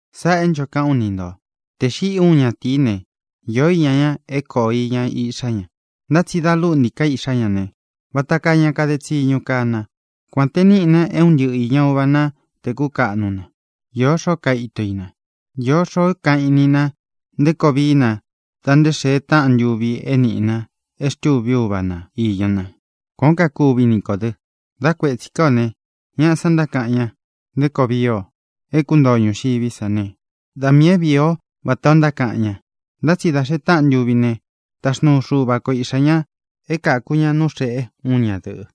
Sáꞌā é ncho kaꞌán u ni ntō: Tē xiꞌi úun ñatīí ne, īó iña ña é kōo iña iꞌxá ña. Ntá tsi dā lúꞌntī ká iꞌxá ña ne, vata kaa ña kade tsiñu kaa na, kuān te níꞌi na é un ntɨꞌɨ īña uva ná tē kúkaꞌnu na. Īó xoó kaito i na. Īó xoó kaꞌan í ni nā nté koo vií na dá nte xēe táꞌan ntuvi é nīꞌi na e xtúvi úva na īña na. Kuān ó kuvi ni kō dɨ. Dá kuētsi ká ō ne, ñaꞌa san ntákaꞌan ña nté koo vii o é kuntoo o ñūxiví sa ne, da miī é vīi o vátā ó ntákaꞌan ña. Ntá tsi dā xee táꞌan ntuvi ne, taxnuu Xuva ko Iꞌxā ña é kāku ña nú xēꞌe úun ña dɨ̄ꞌɨ,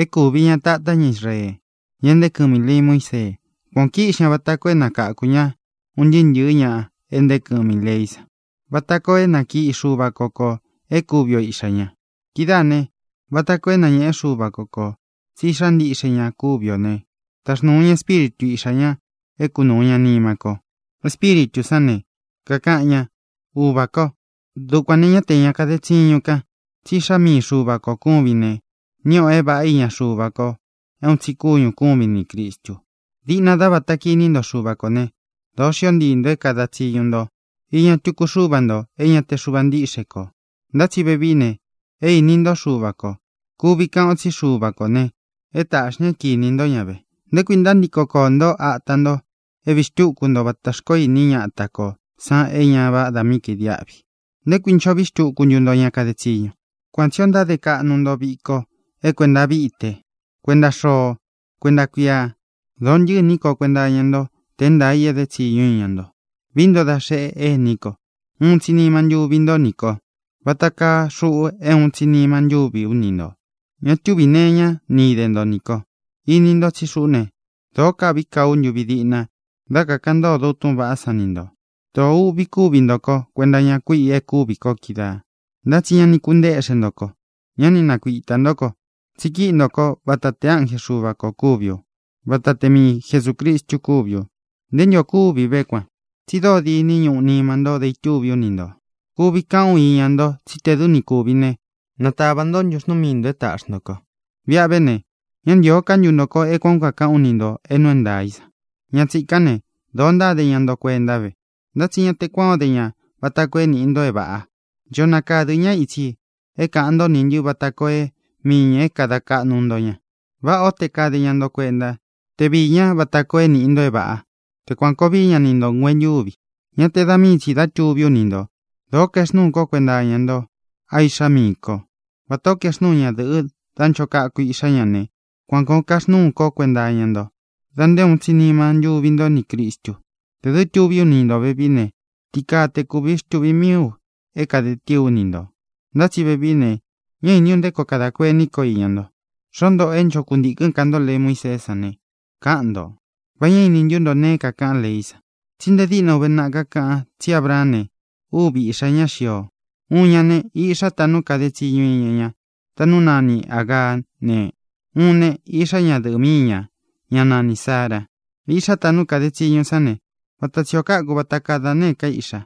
é kūvi ña tatá ña Israee, ña é ntēé kɨmi ī lei Muísee. Kuān o kíꞌxi ña vata koo é nakáku ña un ntɨɨ́ ntɨ̄ɨ́ ña é ntee kɨmi ī leí san, vata koo é nakiꞌi Xuva ko kō e kúvi o iꞌxā ña. Kidáā ne, vata koo é nañēꞌe Xúva ko kō tsí iꞌxá ntiꞌxe ña kúvi ō né, taxnūu ña Espíritu Iꞌxā ña é kunūu ña nima ko. Espíritū sán ne, kakaꞌan ña: “¡Uvā ko!” Dukuān ne, ñá te ña kaden tsiñun kán, tsí iꞌxá mii Xuva kō kúvin ne, níꞌi o é vāꞌá iña Xuva ko é uun tsi kúñū kúvin nī Cristu. Diꞌna dá vāta kiní nto Xuva kō né, dōo xió ntii nto é kāda tsiñu nto iña tuku xúva ntō é ñā te Xuva ntíꞌxe kō. Ntá tsi vevií ne, é īni ntó Xuva kō. Kuvi kaꞌan o tsí Xuva kō ne, é tāꞌxi ña é kinī ntó ña ve. ¿Nté kuī ntántiko koō ntó ata nto é vīí xtuku nto vata xkoó ini ñáta kō san é ñā vádā mí kaidiáꞌvi? ¿Nté kuī ncho vii xtúku nto ña kade tsiñu? Kuan tsī o ntáde kaꞌnu nto viko é kuēnta víte, kuenta xoo, kuenta kuia. Dōo ntɨ́ꞌɨ iní ko kuenta iña ntó tē é ntaā i éde tsiñu ú iña nto. Vií nto da xeꞌe, ení ko, uun tsi nima ntúvi nto nī ko vata kaa xuꞌu é uun tsi nima ntúvi ú ni ntō. Ña túvī nee iñá ni ide nto nī ko. Ini nto tsí xuꞌú ne, dōó kāꞌví kaa ú ntuvi diꞌna dá kakāꞌan ntódo u túꞌūn vaꞌá san ni ntō. Dōo uꞌvi kúvi nto ko kuenta iña kuiꞌi e kúvī ko kídaā, ntá tsi ña ni kuntéꞌxen ntō ko; ñá ni nakuitā ntó ko, tsi kíꞌi nto kó vata te ánje Xuva kō kúvi u, vata te mii Jesūcristu kúvi u. ¿Nté ntu ō kúvi ve kuan? Tsi dóo diní ñuꞌu nima nto dá itúvi ú ni ntō. Kuvi kaꞌan ú iña nto tsí tē dɨ́ ni kūvi né, natavā ntó ntuxnuu mii ntō é tāꞌxi nto ko. Viꞌa ve ne, ¿ñá ntīo ká ntu ntō ko e kuán o kākaꞌán u ni ntō é nuu é ntaā í san? Ña tsīkán ne, dōo ntáde ña nto kuenta ve, ntá tsi ña te kuan o de ña vata koo é nīꞌi nto é vāꞌa. Ncho nakadɨ̄ ñá itsi é kāꞌan ntó nī ntɨ́ vata koo é mii ñā é kada kaꞌnu nto ña. Váꞌā ó te kade ña nto kuenta, te viī ñá vata koo é nīꞌi nto é vāꞌa. Te kuān koo víi ña ni ntō nguentuvi, ñá te da mii tsī dá tuví u ni ntō. Dōó kaexnúu kó kuenta iña nto, a iꞌxá miī ko. Vatā ó kaexnúu ñadɨ̄ꞌɨ dá ncho kaku iꞌxá ña ne, kuān koo kaxnúu kó kuenta iña nto da nté uun tsi nima ntúvi nto nī Cristu. Tē dɨ́ tuví u ni ntō vevií ne, ti kaa te kuvi xtūvi mií u é kāde tíī ú ni ntō, ntá tsi vevií ne, ñá iní u nté koo kadā kuení ko iña nto. Xoó ntōꞌo é ncho kuntīkɨ́n ka nto lei Muíseé san ne, káꞌan ntō: ¿Va ñá ini ntú nto nēe é kākaꞌán leí san? Tsí nte díꞌna uve naꞌa kakáꞌan tsí Abraán ne, úvi iꞌxā ñá xio. Uun ña ne, iꞌxá taꞌnú kade tsiñu iña ña, taꞌnú nani Āgaá ne, uun ne, iꞌxá ñadɨ̄ꞌɨ míi ñā, ñá nanī Sára. Iꞌxá taꞌnú kade tsiñu sán ne, vata tsi ō káku vata kaa da nēé ka iꞌxa,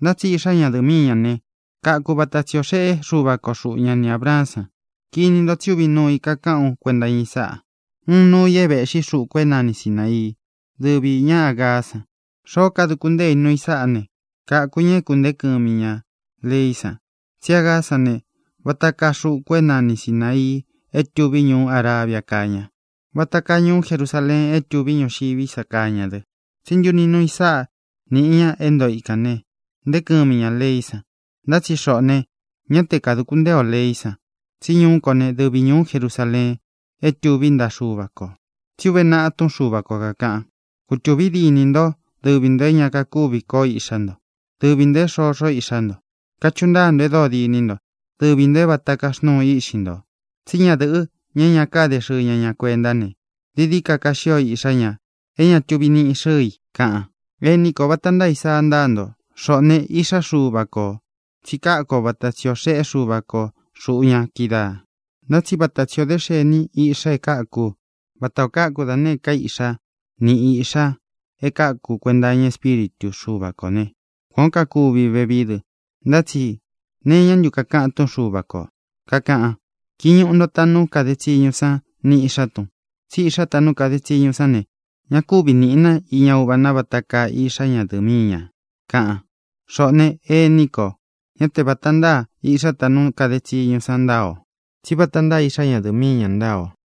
ntá tsi iꞌxá ñadɨ̄ꞌɨ míi ñā ne, kākú vata tsi ō xeꞌé Xuva ko xuꞌu ña ni Ābraán san. Kini nto tsi úvi nuu i kakaꞌán u kuenta iña i sáꞌā. Uun nuu i é vēꞌxí xuku é nani Sināii, dɨ́vi īña Ágaá san. Xoó kaduku ntée i nuu i sáꞌā ne, káku ñā é kuntēé kɨmi ñā leí san. Tsí Agaá san ne, vata kaa xuku é nani Sināii é tuví ñuú Arabia káa ña, vata kaa ñuú Jerusaleen é tuví ñuxiví sa kaa ña dɨ. Tsi ntúni nuu i sáꞌa nī ña é ntoo ikān ne, nteé kɨmi ñā leí san. Ntá tsi xoꞌō ne, ñá te kadūku ntée ō leí san, tsí ñuu kó ne, dɨvi ñūú Jerusaleen é tuví ntaꞌa Xuva kō. Tsí uve naꞌa túꞌun Xuva ko kākaꞌan: Kutūvi díni nto, dɨvi ntō é ña kakúvi koo iꞌxá nto, dɨvi ntō é xoxo iꞌxá nto. Kachuꞌu ntáa nto é dóo diní nto, dɨvi ntō é vata kaxnúu iꞌxi nto. Tsí ñadɨ̄ꞌɨ, ña é ña káde xɨɨ ña ña kuentá ne, dií dií ka kaxio iꞌxá ña é ñā é tuvi niꞌi xɨɨ i, kaꞌan. Ení ko, vata ntáa Isaa ntáa nto. Xoꞌō ne, iꞌxá Xuva ko ō, tsi káku o vata tsi ō xeꞌé Xuva ko xūꞌu ña kídaā. Ntá tsi vata tsi ō dé xeni iꞌxá e káku vata ō káku da nēé ka iꞌxá ni īꞌxá e káku kuenta iña Espíritu Xuva kō né, kuān ó kakuvi vevií dɨ. Ntá tsi ¿nee iñá ntu kakaꞌan túꞌun Xuva kō? Kakaꞌan: “Kiñuꞌu nto taꞌnú kade tsiñú san ni īꞌxá tun, tsí iꞌxá taꞌnú kade tsiñú san ne, ña kúvi nīꞌi na iña uva na vata kaa iꞌxá ñadɨ̄ꞌɨ míi ñā”, kaꞌan. Xoꞌō ne, ení ko, ñá te vāta ntáa iꞌxá taꞌnú kade tsiñú san ntáa o, tsí vata ntáa iꞌxá ñadɨ̄ꞌɨ míi ña ntáa o.